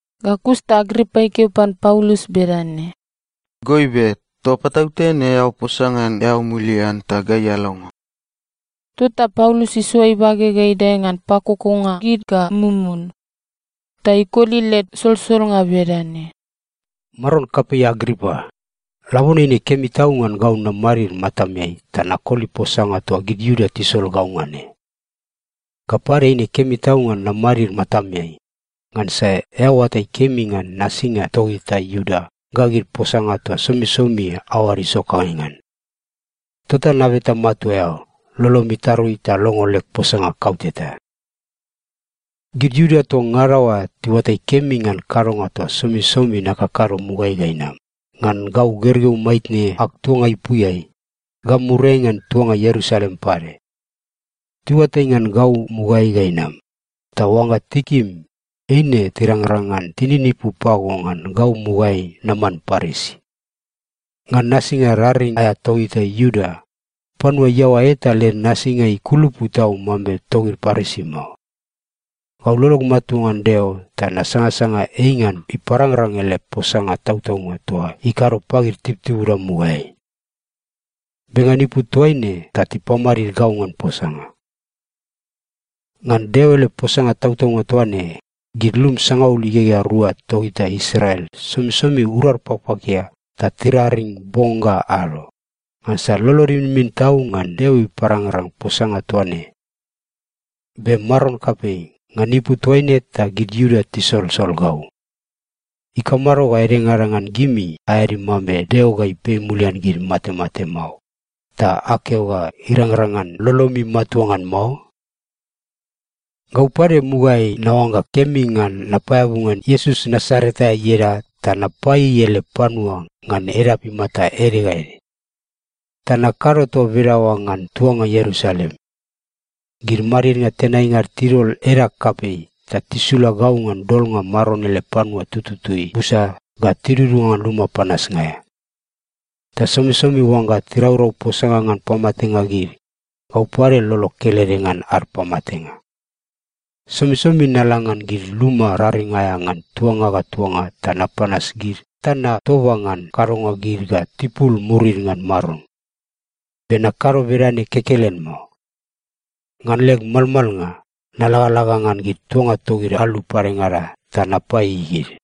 Ga kus ta Agripa ikeo pan Paulus bedane, “Goibe, toa patautene eao posa ngan eao mulian ta gai alongo.” Tota Paulus isoa ibage ga idae ngan pakokonga gid ga mumun. Ta ikoli led solsolnga bedane, “Maron kapei Agripa, labone eine kemi tau ngan gau namadid matameai ta nakoli posanga toa gid Iuda tisol gau ngan ne. Ga pade, eine kemi tau ngan namadid matameai, ngansa eao oatai kemi ngan nasinga togita Iuda ga gid posanga toa somisomi aoada isokangai ngan. Tota nabeta matua eao, lolom itarui ta longo leg posanga kauteta. “Gid Iuda toa ngada oa tiuatai kemi ngan kadonga toa somisomi nakakado mugaeai ga inam, ngan gau gergeu maitne ag tuanga ipuiai, ga muriai ngan tuanga Ierusalem pade. Tiuatai ngan gau mugaeai ga inam, ta oangga tikim, eine tirangrang ngan tininipu pago ngan gau mugaeai naman Parisi. Ngan nasinga raring aea togita Iuda, panua iaoa eta led nasinga ikulupu tau mambe togid Parisi mao. Gau lolog matua ngan Deo ta nasangasanga ei ngan iparangrang ele posanga tautaunga toa ikado pagid tibutibuda mugaeai. Be ngan ipu toaine ta tipamadid gau ngan posanga. Ngan Deo ele posanga tautaunga toa ne, gid lum sangaul igegea rua togita Israel somisomi urad pakpakia ta tiraring bong ga ado, ngansa lolod iminmin tau ngan Deo iparangrang posanga toa ne. Be maron kapei, ngan ipu toaine ta gid Iuda tisolsol gau. Ikamado ga edengada ngan gimi aeadi mambe Deo ga ipei mulian gid matemate mao, ta akeo ga irangrang ngan lolomi matua ngan mao? “Gau pade mugaeai naoangga kemi ngan napaeabu ngan Iesus Nasaret aea ieda ta napaieiei ele panua ngan edap imata ede ga ede. Ta nakado toa bedaoa ngan tuanga Ierusalem. Gid madidnga tenainga ad tidol edag kapei ta tisula gau ngan dolnga Maron ele panua tututui busa ga tidudunga ngan luma panasnga aea. Ta somisomi oangga tiraurau posanga ngan pamatenga gid, gau pade lolog kelede ngan ad pamatenga. Somisomi nala ngan gid luma raring aea ngan tuanga ga tuanga ta napanas gid ta natoba ngan kadonga gid ga tipul murid ngan Maron. Be nakado bedane kekelen mao. Ngan leg malmalnga, nalagalaga ngan gid tuanga togid alu padengada ta napaieiei gid.”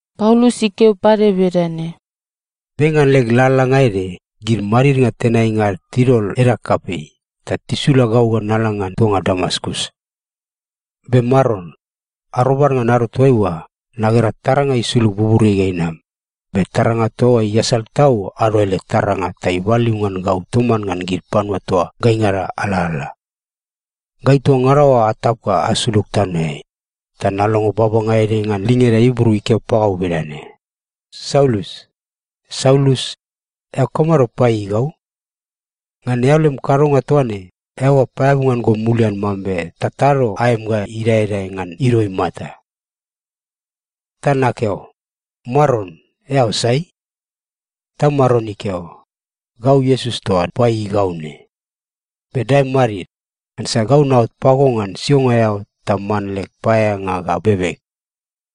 Paulus ikeo pade bedane, “Be ngan leg lalalanga ede, gid madidnga tenainga ad tidol edag kapei ta tisula gau ga nala ngan tuanga Damaskus. Be maron, arobad ngan ado toaiua, nagera taranga isulug buburiai ga inam, be taranga toa oa iasal tau ado ele taranga ta ibaliu ngan gau toman ngan gid panua toa gaingada alalala. Gai toa ngada oa atap ga asulug tanoeai, ta nalongo babanga ede ngan lingeda Ibru ikeo pagau bedane, ‘Saulus, Saulus, eao kamado paieiei gau? Ngan eao lem kadonga toa ne, eao ga paeabu ngan go mulian mambe tatado aem ga idaedae ngan ido imata.’ “Ta nakeo, ‘Maron, eao sai?’ “Ta Maron ikeo, ‘Gau Iesus toa paieiei gau ne. Be dae madid. Ngansa gau naot pago ngan sionga eao ta man leg paeaeanga ga bebeg,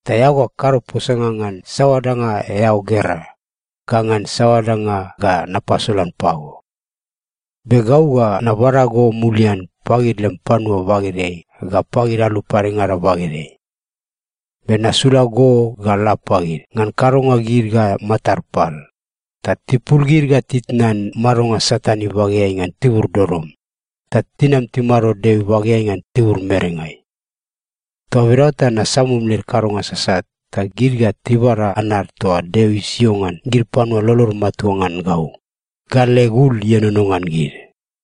ta eao ga kado posanga ngan saoa danga eao gera, ga ngan saoa danga ga napasolan pago. Be gau ga nabada go mulian pagid lem panua bagedeai ga pagid alu padengada bagedeai. Be nasula go ga la pagid ngan kadonga gid ga matad pal, ta tipul gid ga titnan madonga Satan ibageai ngan tibur dodom, ta tinam timado Deo ibageai ngan tibur merengai. Toa bedaoa ta nasamum led kadonga sasat, ta gid ga tibada anad toa Deo isio ngan gid panua lolod matua ngan gau, ga leg ul ienono ngan gid.’”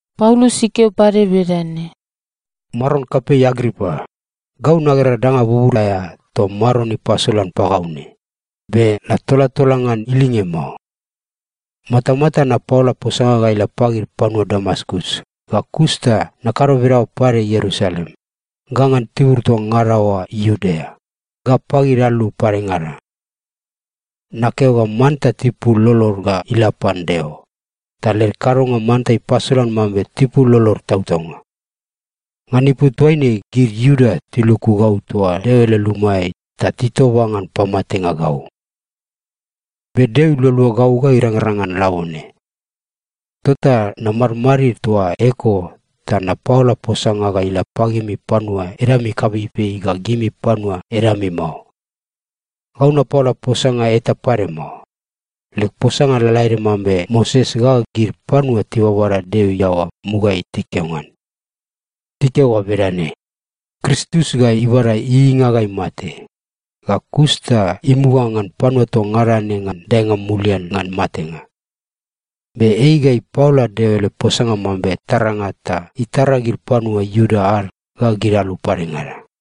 Paulus ikeo pade bedane, “Maron kapei Agripa, gau nagera danga bubur aea toa Maron ipasolan pagau ne, be natolatola ngan ilinge mao. Matamata napaola posanga ga ila pagid panua Damaskus, ga kus ta nakado bedaoa pade Ierusalem, ga ngan tibur toa ngada oa Iudea, ga pagid alu padengada. Nakeo ga manta tipul lolod ga ila pan Deo, ta led kadonga manta ipasolan mambe tipul lolod tautaunga. Ngan ipu toaine gid Iuda tiluku gau toa Deo ele lumaeai ta titoba ngan pamatenga gau. Be Deo ilualua gau ga irangrang ngan labone. Tota namadmadid toa eko ta napaola posanga ga ila pagimi panua edami kapeipei ga gimi panua edami mao. Gau napaola posanga eta pade mao. Leg posanga lalaede mambe Moses ga gid panua tibabada Deo iaoa mugaeai tikeo ngan. Tikeo ga bedane: Kristus ga ibada ieieinga ga imate. Ga kus ta imuga ngan panua toa ngada ne ngan daenga mulian ngan matenga. Be ei ga ipaola Deo ele posanga mambe taranga ta itara gid panua Iuda ad ga gid alu padengada.”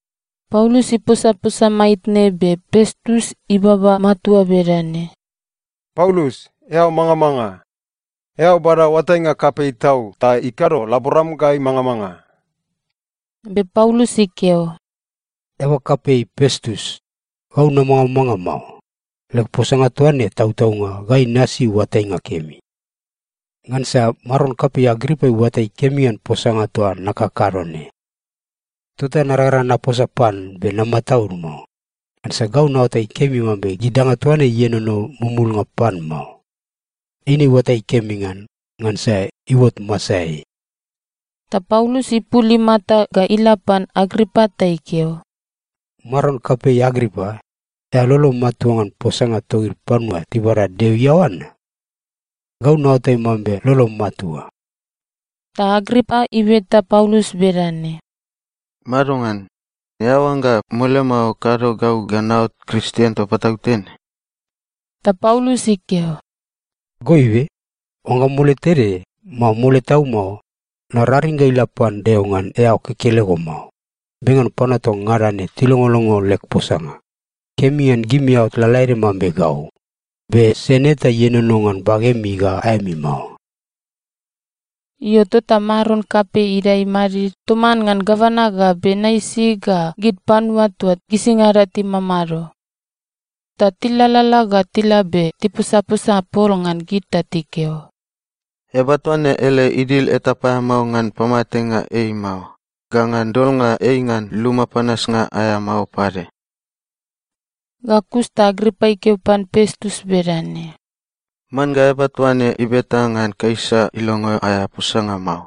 Paulus iposaposa maitne be Pestus ibaba matua bedane, “Paulus, eao mangamanga! Eao bada oatainga kapei tau ta ikado laboram ga imangamanga.” Be Paulus ikeo, “Eaba kapei Pestus, gau namangamanga mao. Leg posanga toa ne tautaunga ga inasi oatainga kemi. Ngansa maron kapei Agripa iuatai kemi ngan posanga toa nakakado ne. Tota narangrang ngan naposa pan be namataud mao. Ngansa gau naoatai kemi mambe gid danga toa ne ienono mumulnga pan mao. Eine iuatai kemi ngan, ngansa iuot masaeai.” Ta Paulus ipul imata ga ila pan Agripa ta ikeo, “Maron kapei Agripa, eao lolom matua ngan posanga togid panua tibada Deo iaoa na? Gau naoatai mambe lolom matua.” Ta Agripa ibeta Paulus bedane, “Madongan? Eao oangga mole mao kado gau ga naot Kristien toa patautene?” Ta Paulus ikeo, “Goibe, oangga mole tede, mao mole tau mao, nararing ga ila pan Deo ngan eao kekelego mao, be ngan panua toa ngada ne tilongolongo leg posanga, kemi ngan gimi aot lalaede mambe gau, be sen eta ienono ngan bagemi ga aemi mao.” Io, tota maron kapei idae imadid toman ngan gavana ga Bernaisi ga gid panua toa gisingada timamado. Ta tilalala ga tila be tiposaposa pol ngan gid ta tikeo, “Eaba toa ne ele idil eta paeamao ngan pamatenga ei mao ga ngan dolnga ei ngan luma panasnga aea mao pade.” Ga kus ta Agripa ikeo pan Pestus bedane, “Man ga eaba toa ne ibeta ngan Kaisa ilongo aea posanga mao.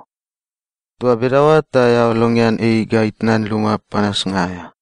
Toa bedaoa ta eao longean ei ga itnan luma panasnga aea.”